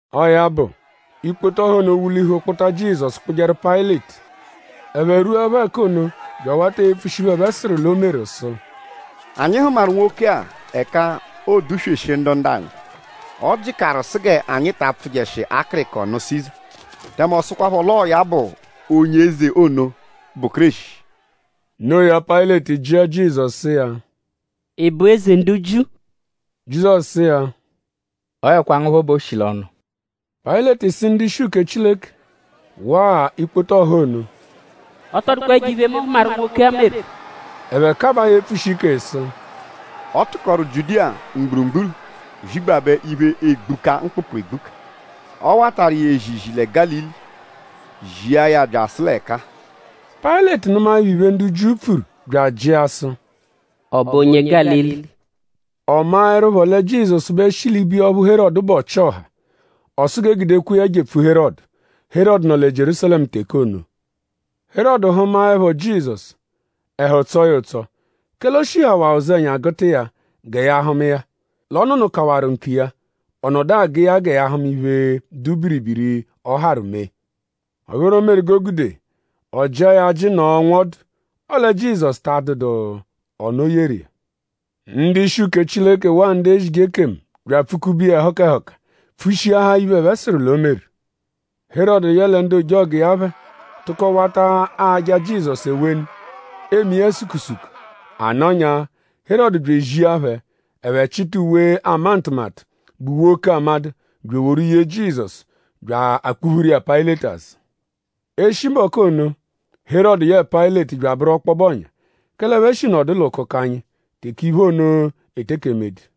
Ọo ya bụ; ikpoto ọha ono wulihu kpụta Jizọsu kpụjeru Payịleti. Ẹphe rwuẹpho ẹka ono bya awata epfushi iphe, ẹphe sụru l'o meru sụ: “Anyi hụmaru nwoke-a ẹka oodusweshi ndu ndu-anyi. Ọ jịkaru sụ g'anyi ta apfụjeshi akịriko nụ Siza; tẹme ọ sụkwapho l'ọo ya bụ onye eze ono, bụ Kéreshi.” No iya; Payịleti jịa Jizọsu sụ iya: “?Ị bụ Eze ndu Jiu?” Jizọsu sụ iya: “Ọoekwa ngu phọ bẹ o shi l'ọnu.” Payịleti sụ ndu-ishi uke Chileke waa ikpoto ọha ono: “Ọ tọ dụkwa ẹjo-iphe, mu hụmaru, nwoke-a meru.” Ẹphe kabaa ya epfushi ike sụ: “Ọ tụkoru Jiudiya mgburugburu zigbabẹ iphe, egbuka mkpụkpu egbuka. Ọ watarụ iya ezizi lẹ Gálili; zia ya byasụ l'ẹka-a.” Payịleti nụmaepho iphe, ndu Jiu pfuru bya ajịa sụ: “?Ọ bụ onye Gálili?” Ọ maẹrupho lẹ Jizọsu bẹ shi ibiya ọphu Herọdu bụ ọchi-ọha; ọ sụ g'e gudekwa iya jepfu Herọdu. Herọdu nọ lẹ Jierúsalẹmu teke ono. Herọdu hụmaepho Jizọsu; ẹhu tsọo ya ụtso; kẹle o shihawaa ụzenya gụta iya gẹ ya hụma iya; l'ọ nụnukawaru nkiya; ọ nọdu agụ iya gẹ ya hụma iphe, dụ biribiri, ọo-harụ mee. Ọ bụru iphe ono meru g'o gude; ọ jịa ya ajị nọo nwọdu; ọle Jizọsu ta adụdu ọnu, o yeru iya. Ndu-ishi uke Chileke waa ndu ezije ekemu bya apfụ-kube iya ẹhuka ẹhuka; pfushiahaa iphe, ẹphe sụru l'o meru. Herọdu yẹle ndu ojọgu iya phẹ tụko wata aja Jizọsu ewenu; eme iya sukusuku. A nọnyaa; Herọdu bya ezia phẹ; ẹphe chịta uwe, ama ntụmatu, bụ uwe oke amadụ bya eworu yee Jizọsu bya akpuphuru iya Payịleti azụ. Eshi mbọku ono; Herọdu yẹe Payịleti bya abụru ọkpobe ọ̀nyà; kẹle ẹphe shi nọdu l'ụkukanyi teke iphe ono eteke emedu.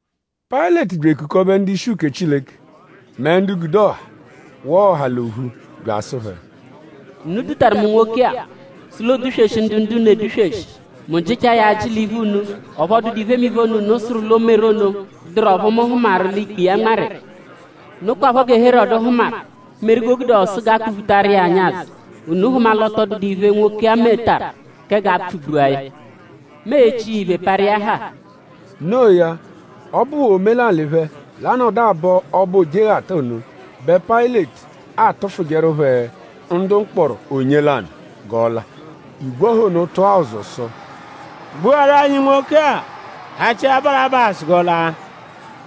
Payịleti bya ekukọbe ndu-ishi uke Chileke; mẹ ndu gude ọha; waa ọha l'ophu bya asụ phẹ: “Unu dutaru mu nwoke-a sụ l'oodusweshi ndu ndu-unu edusweshi. Mu jịchaa ya ajị l'iphu unu; ọphu ọ dụdu iphemiphe ono, unu sụru l'o meru ono, dụru ọphu mu hụmaru l'ikpe iya nmarụ iya. Nokwaphọ gẹ Herọdu ahụmaduru, meru g'o gude ọ sụ g'a kpụ-phutaru iya anyi azụ. Unu hụma l'ọ tọ dụdu iphe, nwoke-a metaru kẹ g'a pfụ-gbua ya. Mu e-chi iya iphe parụ iya haa.” Noo ya; ọ bụwaa omelalị phẹ l'anọdu abọ Ọbo Ojeghata ono bẹ Payịleti atụfujeru phẹ ndu mkpọro onye lanụ g'ọ la. Igwe ọha ono tụa ụzu sụ: “Gbuaru anyi nwoke-a; hachia Barabasu g'ọ la.”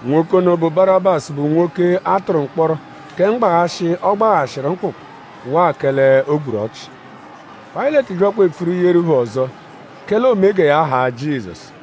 Nwoke ono, bụ Barabasu bụ nwoke, a tụru mkpọro kẹ mgbaghashị, ọ gbaghashịru mkpụkpu waa kẹle o gburu ọchi. Payịleti byakwa bya epfuru yeru phẹ ọzo; kẹle oome gẹ ya haa Jizọsu.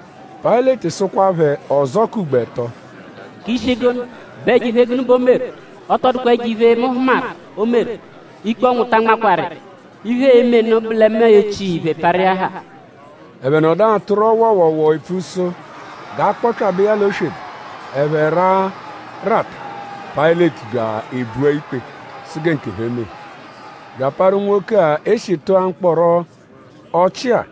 Payịleti sụkwa phẹ ọzo k'ugbo ẹto: “?K'ishi gụnu??Bụ ẹjo-iphe gụnu bẹ o meru? Ọ tọ dụkwa ẹjo-iphe, mu hụmaru, o meru. Ikpe ọnwu ta anmakwaru iya. Iphe, e-me nụ bụ lẹ mu e-chi iya iphe parụ iya haa.” Ẹphe nọdu atụro wọowoowoo epfu sụ g'a kpọpyabe iya l'oswebe. Ẹphe raa; rata. Payịleti bya ebua ikpe sụ gẹ nkephẹ mee. Bya aparụ nwoke-a, e shi tụa mkpọro ọchi-a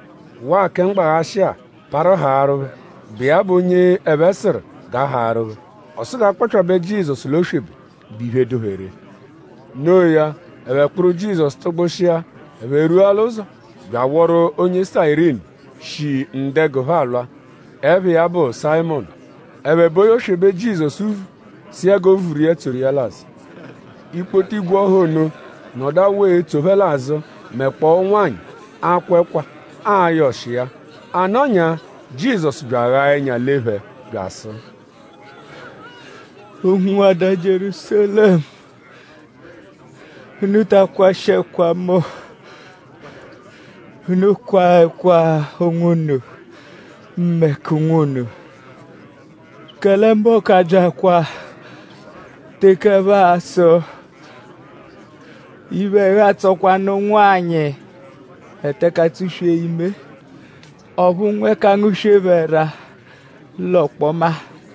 waa kẹ mgbaghashị-a parụ haarụ phẹ, bụ iya bụ onye ẹphe sụru g'a haarụ phẹ. Ọ sụ g'a kpọpyabe Jizọsu l'oswebe, bụ iphe dụ phẹ ree. No iya; ẹphe kpụru Jizọsu tụgbushia. Ẹphe rwua l'ụzo bya awọru onye Sayirini, shi ndu-ẹgu phẹ alwa, ẹpha iya bụ Sayịmonu. Ẹphe bo iya oswebe, Jizọsu vu sụ iya g'o vuru iya; tsoru iya l'azụ. Ikpoto igwe ọha ono nọdu awụ etso phẹ l'azụ mẹkpoo ụnwanyi, akwa ẹkwa; ayọ ọshi iya. A nọnyaa; Jizọsu bya aghaa ẹnya lee phẹ bya asụ: “Ụnwuada Jierúsalẹmu; unu ta akwashị ẹkwa mu. Unu kwaa ẹkwa onwunu mẹ k'ụnwu unu. Kẹle mbọku abya teke ẹphe a-sụ: ‘Iphe ẹhu atsọkwanu ụnwanyi, eteke atsụ-swee ime; ọphu nwa 'eke angụ-swee phẹ ẹra l'ọkpoma.’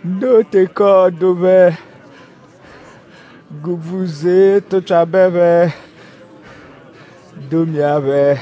Noo teke ọo-dụ phẹ g'úbvú zee tụpyabe phẹ domia phẹ.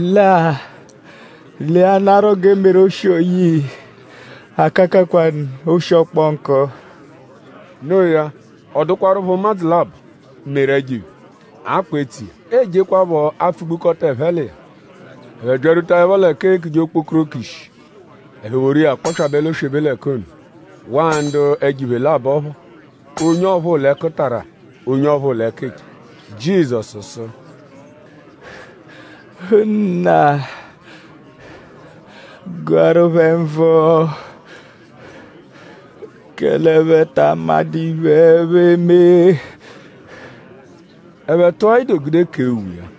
Lẹ-a; leanarọ g'e meru oshi-oyii; akakakwanụ oshi, ọkponku.” Noo ya; ọ dụkwarupho ụmadzu labọ, meru ẹjo-iphe, a kpụ etso iya; eejekwaphọ apfụ-gbukọta ẹphe l'iya. Ẹphe byarwutaẹpho l'ẹka eekuje “Okpokoroko Ishi”; ẹphe woru iya kpọpyabe l'oswebe l'ẹka ono; waa ndu ẹjo-iphe labọ phọ. Onye ọphuu l'ẹkutara; onye ọphuu l'ẹkicha. Jizọsu sụ: “Nna; gụaru phẹ nvụ; kẹle ẹphe ta amadụ iphe, ẹphe eme.” Ẹphe tụa ido gude kee uwe iya.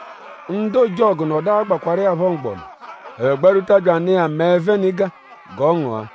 Ndu ojọgu nọdu agbakwarụ iya phọ mgbọnu. Ẹphe gbarwuta bya anụ iya mẹe-venịga g'ọ ngụa;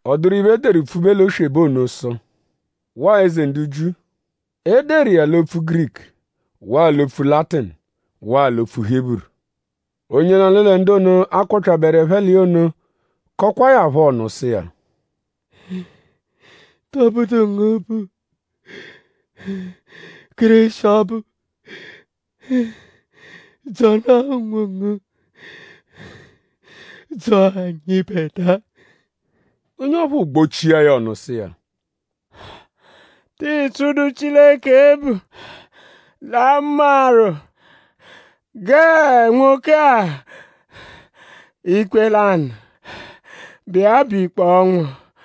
Ọ dụru iphe, e deru pfube l'oswebe ono sụ: “Waa Eze ndu Jiu.” E deru iya l'opfu Giriku; waa l'opfu Latinu; waa l'opfu Hiburu. Onye lanụ lẹ ndu ono, a kpọpyaberu ẹphe l'iya ono kọkwaa ya phọ ọnu sụ iya: “?Tọbudu ngu bụ Kéreshi ọbu? Dzọnaa onwongu; dzọo anyịbedua.” Onye ọphuu gbochia ya ọnu sụ iya: “?Tịi tsụdu Chileke ebvu; l'a nmarụ gẹe nwoke-a ikpe lanụ, bụ iya bụ ikpe ọnwu?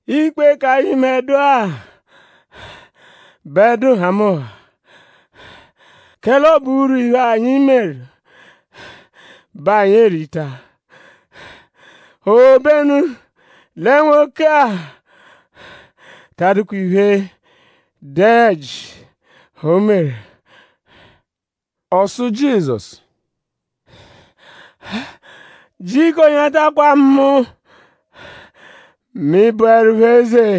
Ikpe k'anyịbedua bẹ dụ nhamụnha; kẹle ọ bụ urwu iphe, anyi meru bẹ anyi erita; obenu lẹ nwoke-a ta adụdu iphe, dụ ẹji, o meru.” Ọ sụ Jizọsu: “Jiko nyatakwa mu; mẹ ị -bụerupho eze.”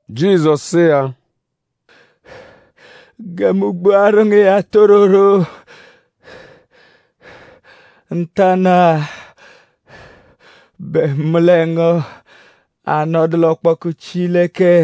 Jizọsu sụ iya: “Gẹ mu gbuaru ngu iya tororo; ntanụ-a bẹ mu lẹ ngu a-nọdu l'ọkpoku Chileke.”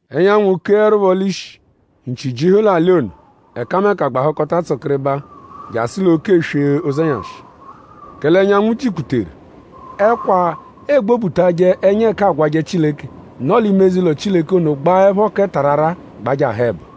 Ẹnyanwu keẹrupho l'ishi; nchi jihu l'alị ono. Ẹkameka gbahụkota tsụkiribaa jasụ l'oke-eswe ụzenyashi; kẹle ẹnyanwu jikputeru; ẹkwa, egbobutajẹ ẹnya ẹka aagwajẹ Chileke, nọ l'ime eze-ụlo Chileke ono gbaẹpho kẹ tararaa gbajahụ ẹbo.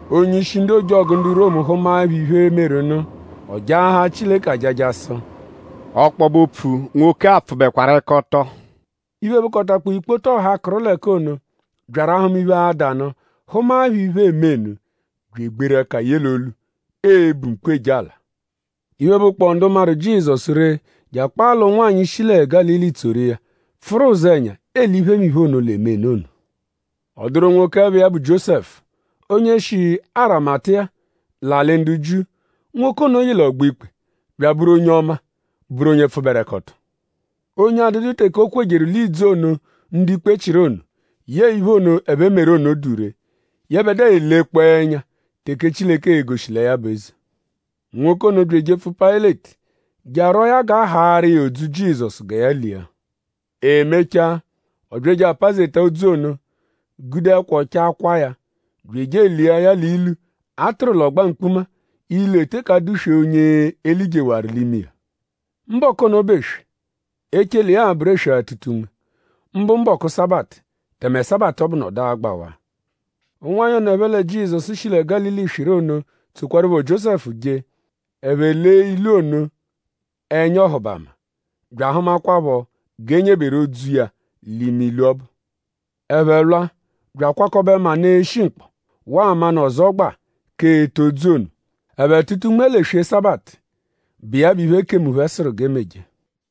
Onye-ishi ndu ojọgu ndu Romu hụmaepho iphe, meru nụ; ọ jaahaa Chileke ajaja sụ: “Ọkpobe-opfu; nwoke-a pfụbekwaru-ẹka-ọto!” Iphe, bụkotakpoo ikpoto ọha, kụru l'ẹka ono, byaru ahụma iphe, ada nụ; hụmaepho iphe, eme nụ bya egberu ẹka ye l'olu; ebu mkpu; eje ala. Iphe, bụkpoo ndu maru Jizọsu ree; je akpaa l'ụnwanyi, shi lẹ Gálili tsoru iya; pfụru ụzenya ele iphemiphe ono, l'eme nụ ono. Ọ dụru nwoke, ẹpha iya bụ Jiósẹfu; onye shi Arimatiya; l'alị ndu Jiu. Nwoke ono yị l'ọgbo-ikpe; bya abụru onye ọma; bụru onye pfụberekoto; onye adụdu teke o kwejeru l'ìdzù ono, ndu-ikpe chịru ono; yẹe iphe ono, ẹphe meru ono dụ ree. Yẹbedua elekpọo ẹnya teke Chileke e-goshi lẹ ya bụ eze. Nwoke ono bya ejepfu Payịleti je arwọo ya g'a haarụ iya odzu Jizọsu gẹ ya lia. E mechaa; ọ bya eje apazeta odzu ono; gude ẹkwa ọchaa kwaa ya; bya eje elia ya l'ilu, a tụru l'ọgba mkpuma; ilu, eteke adụ-swe onye e lijewaru l'ime iya. Mbọku ono bụ eswe, echele iya a-bụru eswe-atụta-unme; mbụ mbọku Sabatụ; tẹme Sabatụ ọbu nọdu agbawaa. Ụnwanyi ono, ẹphe lẹ Jizọsu shi lẹ Gálili swịru ono tsokwarụpho Jiósẹfu je. Ẹphe lee ilu ono ẹnya ọhubama; bya ahụmakwapho g'e nyeberu odzu iya l'ime ilu ọbu. Ẹphe lwa bya akwakọbe manụ, eshi-mkpọ; waa manụ ọzogbaa k'ete odzu ono. Ẹphe tụta unme l'eswe Sabatụ, bụ iya bụ iphe, ekemu phẹ sụru g'e meje.